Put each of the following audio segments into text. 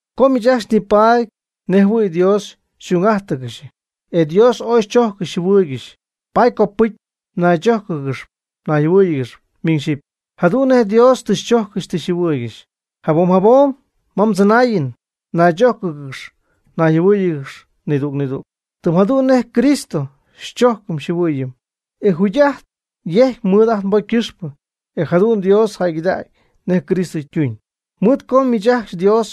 Com miich ajcxy ñipatpy nejjɨhuɨ̈y Dios y'ung'ájtɨgɨxy, e Dios ooy xychojccɨxy xyjɨhuɨɨygɨxy, paady copɨcy naychójcɨgɨxy nayjɨhuɨ́ɨyɨgɨxy miñ xyɨpy, jadu'n nej Dios tɨ xychojccɨxy tɨ xyjɨhuɨɨygɨxy. Jabom jabom ma mdzɨnaayɨn naychójcɨgɨx nayjɨhuɨ́ɨyɨgɨx nidüg nidüg, tɨm jadu'n nej Cristo xychojcɨm xyjɨhuɨɨyɨm, e yjugy'ajt yejcy mɨɨd ajt nbocy ycɨxpɨ, e jadu'n Dios jäygɨdacy nej Cristo ytuñ. Mɨɨd co miich ajcxy Dios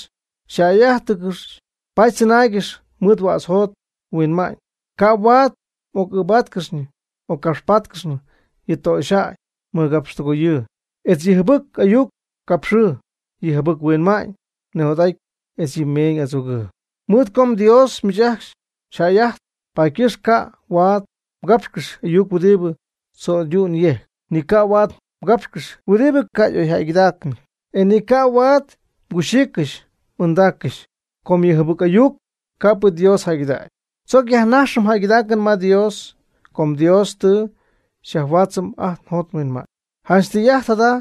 xyjäy'ájtɨgɨxy, paady tzɨnaaygɨxy mɨɨd huädz mjot mhuinma'ñ. Ca' huaad m'oc'ɨɨbáatcɨxyñɨ m'occapxpáatcɨxyñɨ yɨ töxyjäy mɨgapxtɨgoyɨɨ, etz yɨ jɨbɨc ayuc capxɨɨ, yɨ jɨbɨc-huinma'ñ nijot'adɨɨ etz yɨ meeñ adzogɨɨ. Mɨɨd co mDios miich ajcxy xyjäy'ajtp, paady ycɨxp ca' huaad mgápxcɨxɨpy ayuc huɨdibɨ tzo'ydu'ñ yejc, ni ca' huaad mgápxcɨxɨpy huɨdi ca' y'oyjäygɨdaacnɨty, etz ni ca' huaad mguxiiccɨxy m'anɨɨdaaccɨxy, com yɨ jɨbɨc ayuc ca' Dios jäygɨdägy. Tzoc yajnajxɨm jäygɨdaacɨn ma Dios com Dios tɨ xyajhuaatzɨm ajt njot nhuinma'ñ. Janch tɨy'ajt jada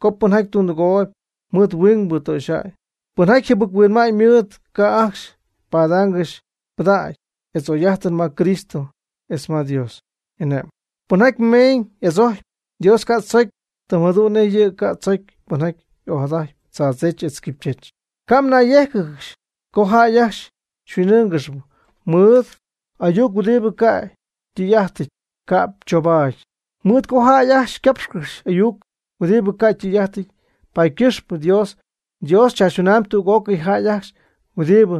co pɨnjaty tundɨgooyb mɨɨd huingbɨ töxyjäy, pɨnjaty jɨbɨc-huinma'ñ mɨɨd, ca' ajcxy padaangɨxy pɨdägy etz oy'ajtɨn ma Cristo etz ma Dios y'ane'mɨn. Pɨnjaty meeñ adzojcp, Dios ca' tzocy, tɨm jadu'n nej yɨ' ca' tzocy pɨnjaty ojadajtp tzaadzech etz quipychech. Ca' mnayyéjcɨgɨxy co jäy ajcxy xyhuin'ɨ́ɨngɨxɨpy mɨɨd ayuc huɨdibɨ ca' ytɨy'ajtɨty ca'p choubaady. Mɨɨd co jäy ajcxy capxcɨxy ayuc huɨdibɨ ca' ytɨy'ajtɨty, paady ycɨxpɨ Dios tzaachytuna'ñ tüg'ócɨy jäy ajcxy huɨdibɨ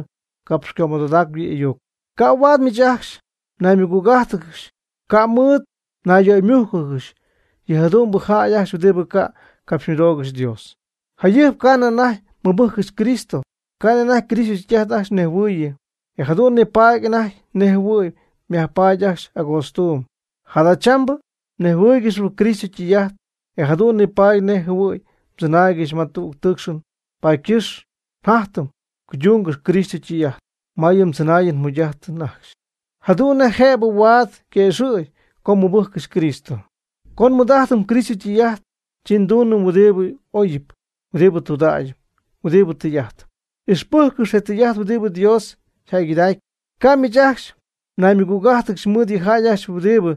capxycömɨdodacp yɨ' y'ayuc. Ca' huaad miich ajcxy mnaymɨgüg'ájtɨgɨxy, ca' mɨɨd mnayyöymújcɨgɨxy yɨ jadu'mbɨ jäy ajcxy huɨdibɨ ca' capxymɨdoogɨxy Dios. Jayɨjp ca'nɨ anajty mmɨbɨjccɨxy Cristo, ca'nɨ anajty Cristo ytɨy'ajt ajcxy mnejhuɨɨy, e jadu'n nipaady anajty nej jɨhuɨ̈y myajpaady ajcxy agootztuum. Jadachambɨ mnejhuɨɨygɨxyp Cristo ytɨy'ajt, e jadu'n nipaady nejjɨhuɨ̈y mdzɨnaaygɨxy ma tüg tɨɨcxɨn. Paady ycɨxp jatyɨm cuydungɨxyp Cristo ytɨy'ajt ma yɨ mdzɨnaayɨn mjugy'ajtɨn ajcxy, jadu'n nej jëbɨ huaad quëxɨ̈gy co mmɨbɨjccɨxy Cristo. Co nmɨɨd'ajtɨm Cristo ytɨy'ajt, chi nduunɨm huɨdibɨ y'oyɨp, huɨdibɨ tudägyɨp, huɨdibɨ tɨy'ajtɨp. Ixpɨjccɨx je tɨy'ajt huɨdibɨ Dios yjäygɨdacpy. Ca' miich ajcxy mnaymɨgüg'ájtɨgɨxy mɨɨd yɨ jäy ajcxy huɨdibɨ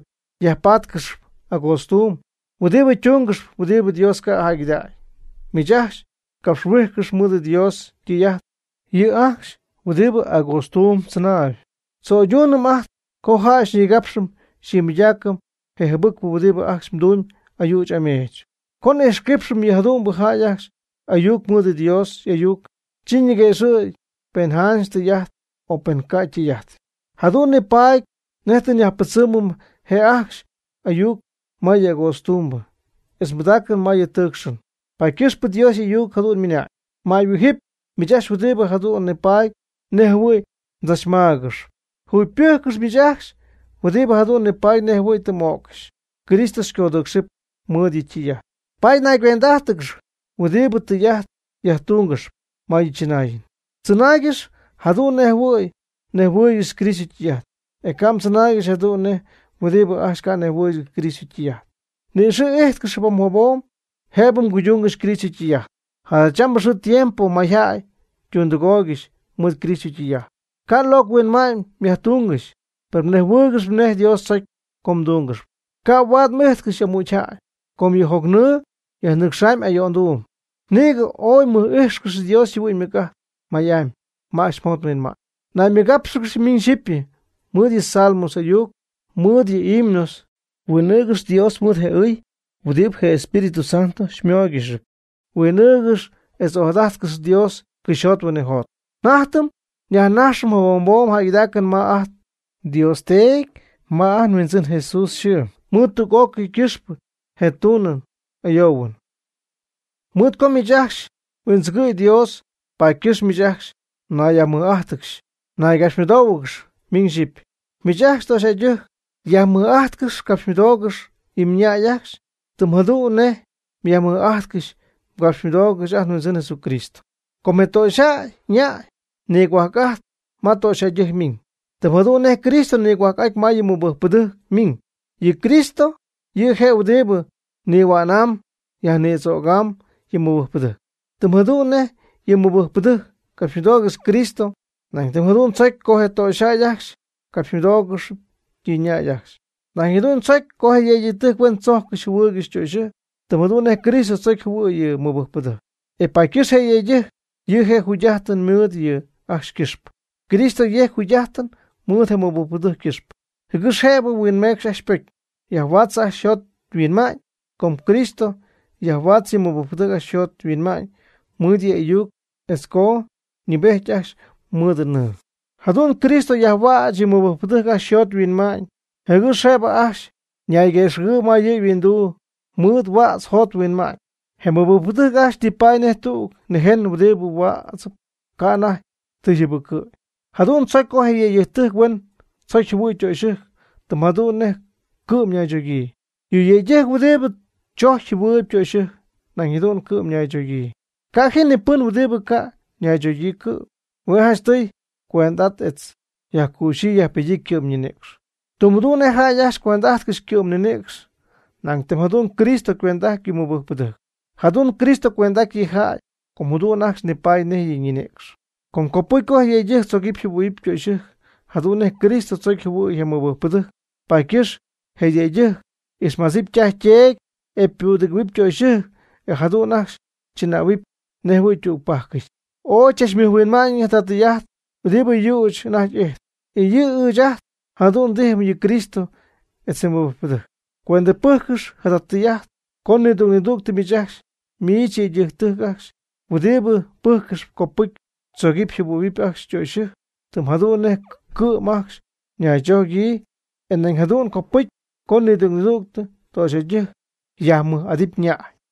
yajpatcɨxp agootztuum, huɨdibɨ tungɨxy huɨdibɨ Dios ca' jäygɨdägy. Miich ajcxy capxhuijcɨx mɨɨd Dios ytɨy'ajt yɨ' ajcxy huɨdibɨ agootztuum tzɨnaayb. Tzo'yduunɨm ajt co jay nigapxcɨxy nimɨydaaccɨxy je jɨbɨcpɨ huɨdibɨ ajcxy ytumyb ayüch ameech. Co n'ixquipxɨm yɨ jadu'mbɨ jäy ajcxy ayuc mɨɨd Dios y'ayuc, chi niguëxɨ̈gy pen janch tɨy'ajt o pen ca' ytɨy'ajtɨty, jadu'n nipaady nej tɨ nyajpɨdzɨmɨm je ajcxy ayuc ma yɨ agootztuum, etz nbɨdaacɨm ma yɨ tɨɨcxɨn. Paady ycɨxpɨ Dios y'ayuc jadu'n ymɨnañ: Mäyhuijɨp miich ajcxy huɨdibɨ jadu'n nipatp nejjɨhuɨ̈y mdzachmaagɨxyp. Jugypɨjccɨx miich ajcxy huɨdibɨ jadu'n nipaady nejjɨhuɨ̈y tɨ m'öccɨxy. Cristo xycodɨ́ɨcxcɨxɨpy mɨɨd yɨ' ytɨy'ajt. Paady naygüend'ájtɨgɨxy huɨdibɨ tɨy'ajt yajtungɨxp ma yɨ chɨnaayɨn. Tzɨnaaygɨx jadu'n nejjɨhuɨ̈y mnejhuɨɨygɨxy Cristo ytɨy'ajt, e ca' mdzɨnaaygɨxy jadu'n nej huɨdibɨ ajcxy ca' nejjɨhuɨɨygɨxy Cristo ytɨy'ajt. Ni'ixɨ̈'ijtcɨx jabom jabom jëbɨ mguydungɨxy Cristo ytɨy'ajt. Jadachambɨ xɨɨ tiempo mayjäy ytundɨgooygɨxy mɨɨd Cristo ytɨy'ajt. Ca' locɨ huinma'ñ myajtungɨxy, per nejhuɨɨygɨxyp nej Dios tzocy co mdúngɨxɨpy. Ca' huaad m'ijtcɨxy amügy jäy, com yɨ jocnɨɨ xyajnɨ́cxcɨxɨpy ayo'nduum. Nïgɨ oy mɨ'ijtcɨxy Dios yjɨhuɨ'ñ ymɨc'ajt may'amy ma ajcxy mjot mhuinma'ñ. Naymɨgápxɨgɨxy miñ xyipy mɨɨd yɨ salmo ayuc, mɨɨd yɨ himnos. Huin'ɨɨgɨx Dios mɨɨd je ɨy huɨdibɨ je Espíritu Santo xymooygɨxyp. Huin'ɨɨgɨx etz ojadajtcɨx Dios cɨxyjot huinɨjot. Jatyɨm yajnajxcɨxy jabom jabom jäygɨdaacɨn ma ajt nDios Teedy ma ajt nHuindzɨn Jesús yxɨɨ, mɨɨd tüg'ócɨy ycɨxpɨ nej ndunɨm n'ayoohuɨm. Mɨɨd co miich ajcxy mhuindzɨgɨ̈y Dios, paady ycɨxp miich ajcxy mnayyajmɨj'ájtɨgɨxy mnaygapxymɨdóohuɨgɨxy miñ xyɨpy. Miich ajcxy töxyjäydɨjc yajmɨj'ajtcɨx capxymɨdoogɨx yɨ mñäy ajcxy, tɨm jadu'n nej myajmɨj'ajtcɨxy mgapxymɨdoogɨxy ajt nHuindzɨn Jesucristo. Com je töxyjäy ñäy nigohuajc'ajtp ma ytöxyɨjc ymiñ, tɨm jadu'n nej Cristo nigohuajc'aty ma yɨ mɨbɨjcpɨdɨjc ymiñ. Yɨ Cristo yɨ'je' huɨdibɨ nihuänamb yajnïdzögamb yɨ mɨbɨjcpɨdɨjc. Tɨm jadu'n nej yɨ mɨbɨjcpɨdɨjc capxymɨdoogɨxy Cristo, nañ tɨm jadu'n tzocy co je töxyjäy ajcxy capxymɨdóogɨxɨpy yɨ ñäy ajcxy. Nañ jadu'n tzocy co je yëydɨjc huen tzocy jɨhuɨ̈y ytöxyɨjc, tɨm jadu'n nej Cristo tzocy jɨhuɨ̈y yɨ mɨbɨjcpɨdɨjc, e paady ycɨxp yejc yɨ' yjugy'ajtɨn mɨɨd yɨ' ajcxy ycɨxpɨ. Cristo yejc yjugy'ajtɨn mɨɨd je mɨbɨjcpɨdɨjc ycɨxpɨ, jɨgɨx jëbɨ huinmecxy ajcxy ypocy, yajhuaatzɨp ajcxy yjot yhuinma'ñ. Cristo yajhuaatzɨ yɨ mɨbɨjcpɨdɨjc ajcxy yjot yhuinma'ñ mɨɨd yɨ'y'ayuc etz co nɨɨbejt ajcxy mɨɨd nɨɨ. Jadu'n Cristo yajhuäch yɨ mɨbɨjcpɨdɨjc ajcxy yjot yhuinma'ñ, jɨgɨx jëbɨ ajcxy nayguëxɨ̈gɨɨyb ma yɨ' yhuinduu mɨɨd huädz yjot yhuinma'ñ. Je mɨbɨjcpɨdɨjc ajcxy nipaady nej tüg nïjen huɨdibɨ huädzɨp, ca' ma ytijy ymächɨty. Jadu'n tzocy co je yëydɨjc huen tzocy jɨhuɨ̈y ytöxɨjc tɨm jadu'n nej cɨ'm naychogyii. Yɨ yëydɨjc huɨdibɨ tzojcp jɨhuɨɨyb ytöxyɨjc nañ jadu'n cɨ'm ñaychogyii. Ca' ji ni pɨn huɨdibɨ ca' ñaychogyii cɨ'm. Hue' janchtɨy ycuend'ajtpy etz yajcüxyii yajpedyii ycɨ'm ninïcx, tɨm jadu'n nej jäy ajcxy cuend'ajtcɨxy ycɨ'm ñinïcx nañ tɨm jadu'n Cristo ycuend'ajtpy yɨ mɨbɨjcpɨdɨjc. Jadu'n Cristo cuend'ajtpy yɨ' yjäy, com jadu'n ajcxy nipaady nej yɨ' ñinïcx. Com copɨcy je yëydɨjc tzogɨ́p jɨhuɨ̈huɨp ytöxyɨjc jadu'n nej Cristo tzocy jɨhuɨ̈y yɨ mɨbɨjcpɨdɨjc. Paady ycɨxp je yëydɨjc ixmadzɨpy ytaj yteedy, e ypudɨgɨ̈huɨpy ytöxyɨjc, e jadu'n ajcxy chɨnähuɨpy nej jɨhuɨ̈y ytügpajcɨty. Ooy chachmɨjhuinma'ñɨty jada tɨy'ajt huɨdibɨ yüch anajty ijtp, e yɨ' ɨɨch jadu'n tijpy yɨ Cristo etz je mɨbɨjcpɨdɨjc. Cuendɨpɨjccɨx jada tɨy'ajt co nidüg nidüg miich yëydɨjctɨjc ajcxy huɨdibɨ pɨjccɨxp copɨcy mdzogɨpy mjɨhuɨ̈huɨpy ajcxy mdöxyɨjc, tɨm jadu'n nej cɨ'm ajcxy mnaychogyii, e nañ jadu'n copɨcy co nidüg nidüg töxyjäydɨjc yajmɨj'adɨpy ñäy.